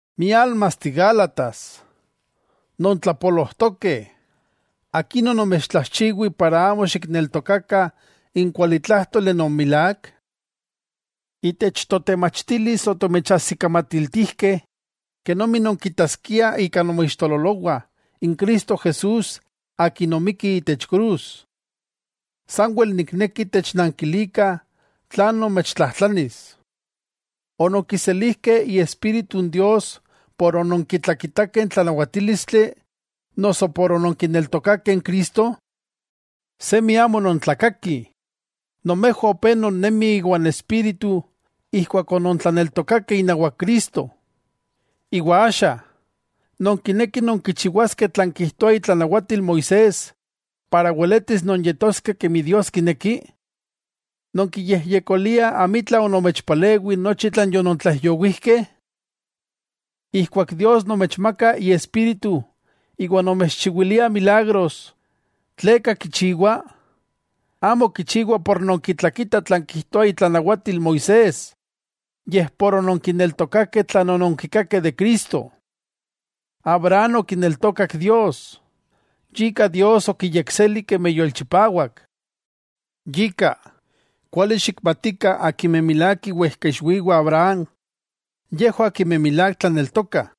¡Miálmasteh Gálatas, nontlapolojtokeh! ¿Akin onomechtlajchiwih, para amo xikneltokakah n kualitlájtoli non milák? Itech totemachtilis otomechajsikamatiltijkeh kenomi nonkitaskiah ika nomoixtololowah n Cristo Jesús Akin omikki itech krus. Sanwel nikneki technankilikah tlan nomechtlajtlanis: ¿Ononkiselijkeh Iespíritu n Dios por ononkitlakitakeh n tlanawatílistli noso por ononkineltokakeh n Cristo? ¡Semi amo nontlakakih! Nomejwah opé non nemih iwan Espíritu ijkuak onontlaneltokakeh inawak Cristo. Iwa axa, ¿nonkinekih nonkichiwaskeh tlan kijtoa itlanawatil Moisés para weletis nonyetoskeh kemi Dios kineki? ¿Nonkiyejyekoliah amitla onomechpalewi nochi tlan yonontlaijyowijkeh? Ijkuak Dios nomechmaka Iespíritu iwa nomechchiwilia milagros, ¿tleka kichiwa? Amo kichiwa por nonkitlakitah tlan kijtoa itlanawatil Moisés yej por ononkineltokakeh tlan ononkikakeh de Cristo. Abraham okineltokak Dios, yika Dios okiyekseli kemi yolchipawak. Yika, kuali xikmatikah akimeh milák iwejkaixwiwah Abraham yejwah akimeh milák tlaneltokah.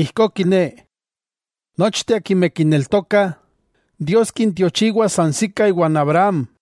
Ijkó kiné, nochteh akimeh kineltokah, Dios kintiochiwa sansikah iwan Abraham.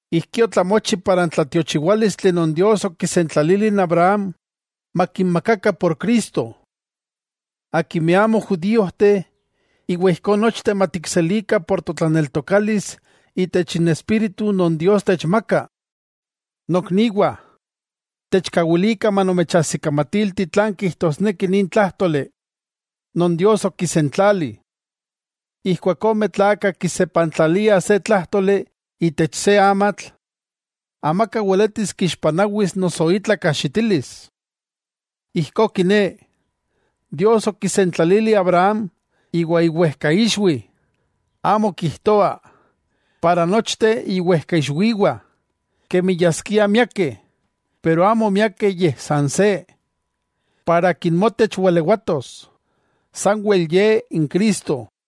Ijkí otlamochi para n tlatiochiwálistli non Dios okisentlalili n Abraham makinmakakah por Cristo, akimeh amo judíojteh, iwa ijkó nochteh matikselikah ika totlaneltokalis itech n Espíritu non Dios techmaka. Nokniwah, techkawilikah manomechajsikamatilti tlan kijtosneki nin tlájtoli non Dios okisentlali. Ijkuak ome tlakah kisepantlaliah se tlájtoli itech se amatl, amaka weletis kixpanawis noso itla kajxitilis. Ijkó kiné, Dios okisentlalili Abraham iwa iwejkaixwi. Amo kijtoa: “Para nochteh iwejkaixwiwah”, kemi yaskiah miakeh, porke amo miakeh yej san se: “Para akin motech walewatos.” Sanwel Ye n Cristo.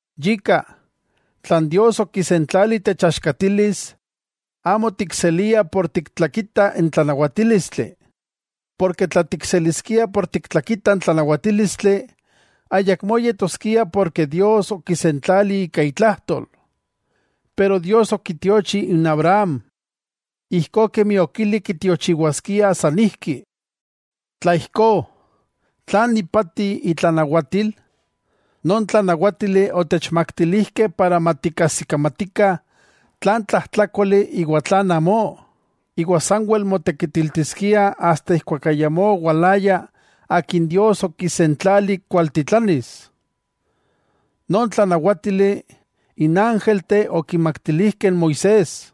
Yika, tlan Dios okisentlali techaxkatilis amo tikseliah por tiktlakitah n tlanawatílistli, porke tla tikseliskiah por tiktlakitah n tlanawatílistli ayakmó yetoskia porke Dios okisentlali ika itlajtol. Pero Dios okitiochi n Abraham ijkó kemi okili kitiochiwaskia sanijki. Tla ijkó, ¿tlan ipati itlanawatil? Non tlanawátili otechmaktilijkeh para matikajsikamatikah tlan tlajtlákoli iwa tlan amó, iwa sanwel motekitiltiskia asta ijkuak ayamó owalaya Akin Dios okisentlali kualtitlanis. Non tlanawátili n ángelteh okimaktilijkeh n Moisés,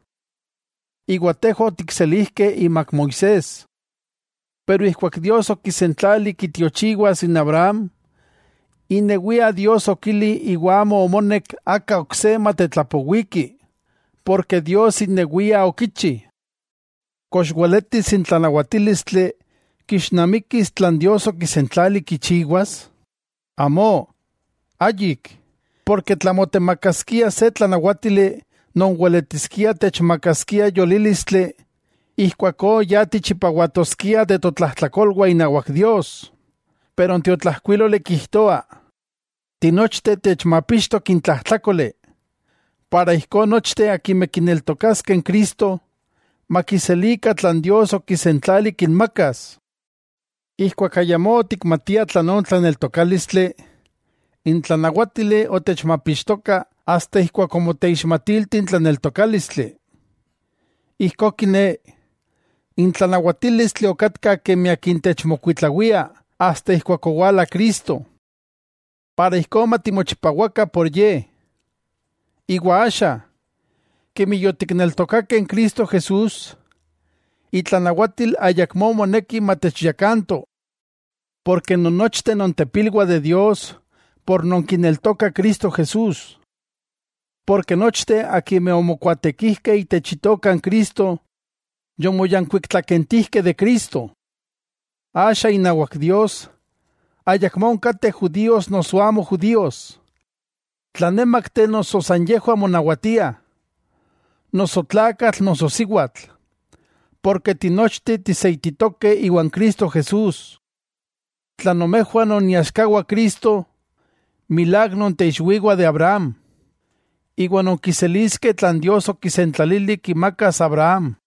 iwa tejwah otikselijkeh imak Moisés. Ijkuak Dios okisentlali kitiochiwas n Abraham, inewia Dios okili iwa amo omonek aka ok se matetlapowiki, porke Dios inewia okichi. ¿Kox weletis n tlanawatílistli kixnamikis tlan Dios okisentlali kichiwas? ¡Amó, ayik! Porke tla motemakaskia se tlanawátili non weletiskia techmakaskia yolílistli, ijkuakó ya tichipawatoskiah de totlajtlakolwah inawak Dios. N tiotlajkuiloli kijtoa, tinochteh techmapixtok n tlajtlákoli, ijkó nochteh akimeh kineltokaskeh n Cristo, makiselikah tlan Dios okisentlali kinmakas. Ijkuak ayamó otikmatiah tlan tlaneltokálistli, n tlanawátili otechmapixtoka asta ijkuak omoteixmatilti n tlaneltokálistli. Ijkó kiné, n tlanawatílistli okatka kemi akin techmokuitlawia asta ijkuak owala Cristo. Iwa ijkó matimochipawakah por Ye. Iwa axa, kemi yotikneltokakeh n Cristo, itlanawatil Moisés ayakmó moneki matechyakanto. Porke nonnochteh nontepilwah de Dios por nonkineltokah Cristo Jesús. Porke nochteh akimeh omokuaatekijkeh itech Itoka n Cristo, yomoyankuiktlakentijkeh de Cristo. Axa inawak Dios, ayakmó onkateh judíos noso amo judíos, tlanemakteh noso san yejwah monawatiah, noso tlakatl noso siwatl, porke tinochteh tiseititokeh iwan Cristo Jesús. Tla nomejwah non iaxkawah Cristo, milák nonteixwiwah de Abraham, iwa nonkiseliskeh tlan Dios okisentlalili kimakas Abraham.